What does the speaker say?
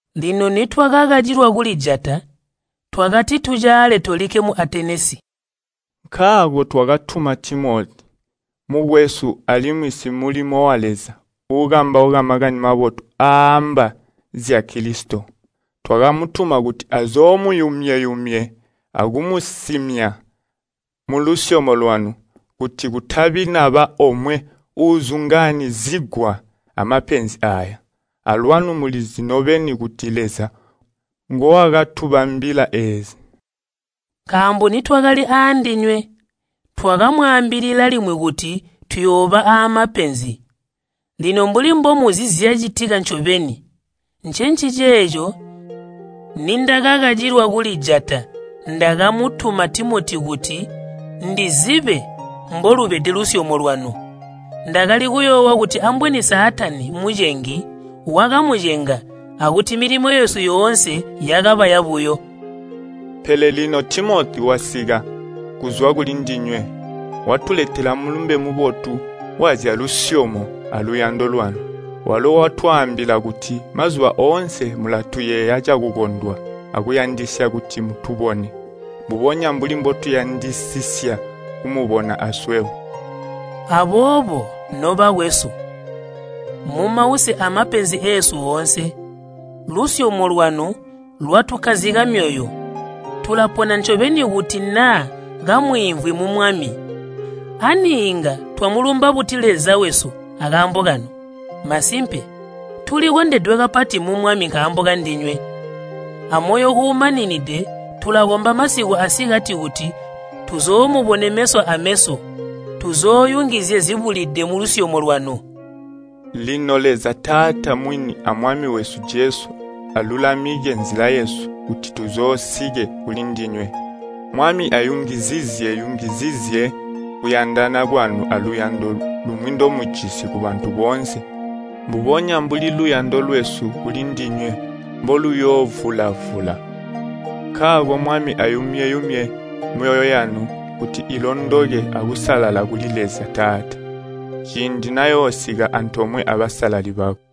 Lino nitwakakacilwa kulijata, twakati tucaale tolikke mu Atenesi. Nkaako twakatuma Timoti, mukwesu alimwi simulimo wa Leza uukambauka Makani Mabotu aaamba zya Kilisito. Twakamutuma kuti azoomuyumye-yumye akumusimya mulusyomo lwanu, kuti kutabi naba omwe uuzungaanyizigwa amapenzi aaya. Alwanu mulizi nobeni kuti Leza ngowakatubambila eezi. Nkaambo nitwakali aandinywe, twakamwaambilila limwi kuti tuyooba aamapenzi. Lino mbuli mbomuzi zyacitika ncobeni. Ncenciceeco nindakakacilwa kulijata ndakamutuma Timoti kuti ndizibe mbolubede lusyomo lwanu. Ndakali kuyoowa kuti ambweni Saatani, mucengi, wakamucenga, akuti milimo yesu yoonse yakaba yabuyo. Pele lino Timoti wasika kuzwa kulindinywe, watuletela mulumbe mubotu wazyalusyomo aluyando lwanu. Walo watwaambila kuti mazuba oonse mulatuyeeya cakukondwa akuyandisisya kuti mutubone, mbubonya mbuli mbotuyandisisya kumubona aswebo. Aboobo, nobakwesu, mumause amapenzi eesu oonse, lusyomo lwanu lwatukkazika myoyo. Tulapona ncobeni kuti naa kamwiimvwi mu Mwami. Ani inga twamulumba buti Leza wesu akaambo kanu? Masimpe, tulikondedwe kapati mu Mwami nkaambo kandinywe. Amoyo uumaninide tulakomba masiku asikati kuti tuzoomubone meso ameso tuzooyungizye zibulide mulusyomo lwanu. Lino Leza Taata mwini a Mwami wesu Jesu alulamike nzila yesu kuti tuzoosike kulindinywe. Mwami ayungizizye-yungizizye kuyandana kwanu aluyando lumwi ndomujisi kubantu boonse mbubonya mbuli luyando lwesu kulindinywe mboluyoovula-vula. Nkaako Mwami ayumye-yumye myoyo yanu kuti ilondoke akusalala kuli Leza Taata, ciindi nayoosika antoomwe abasalali bakwe.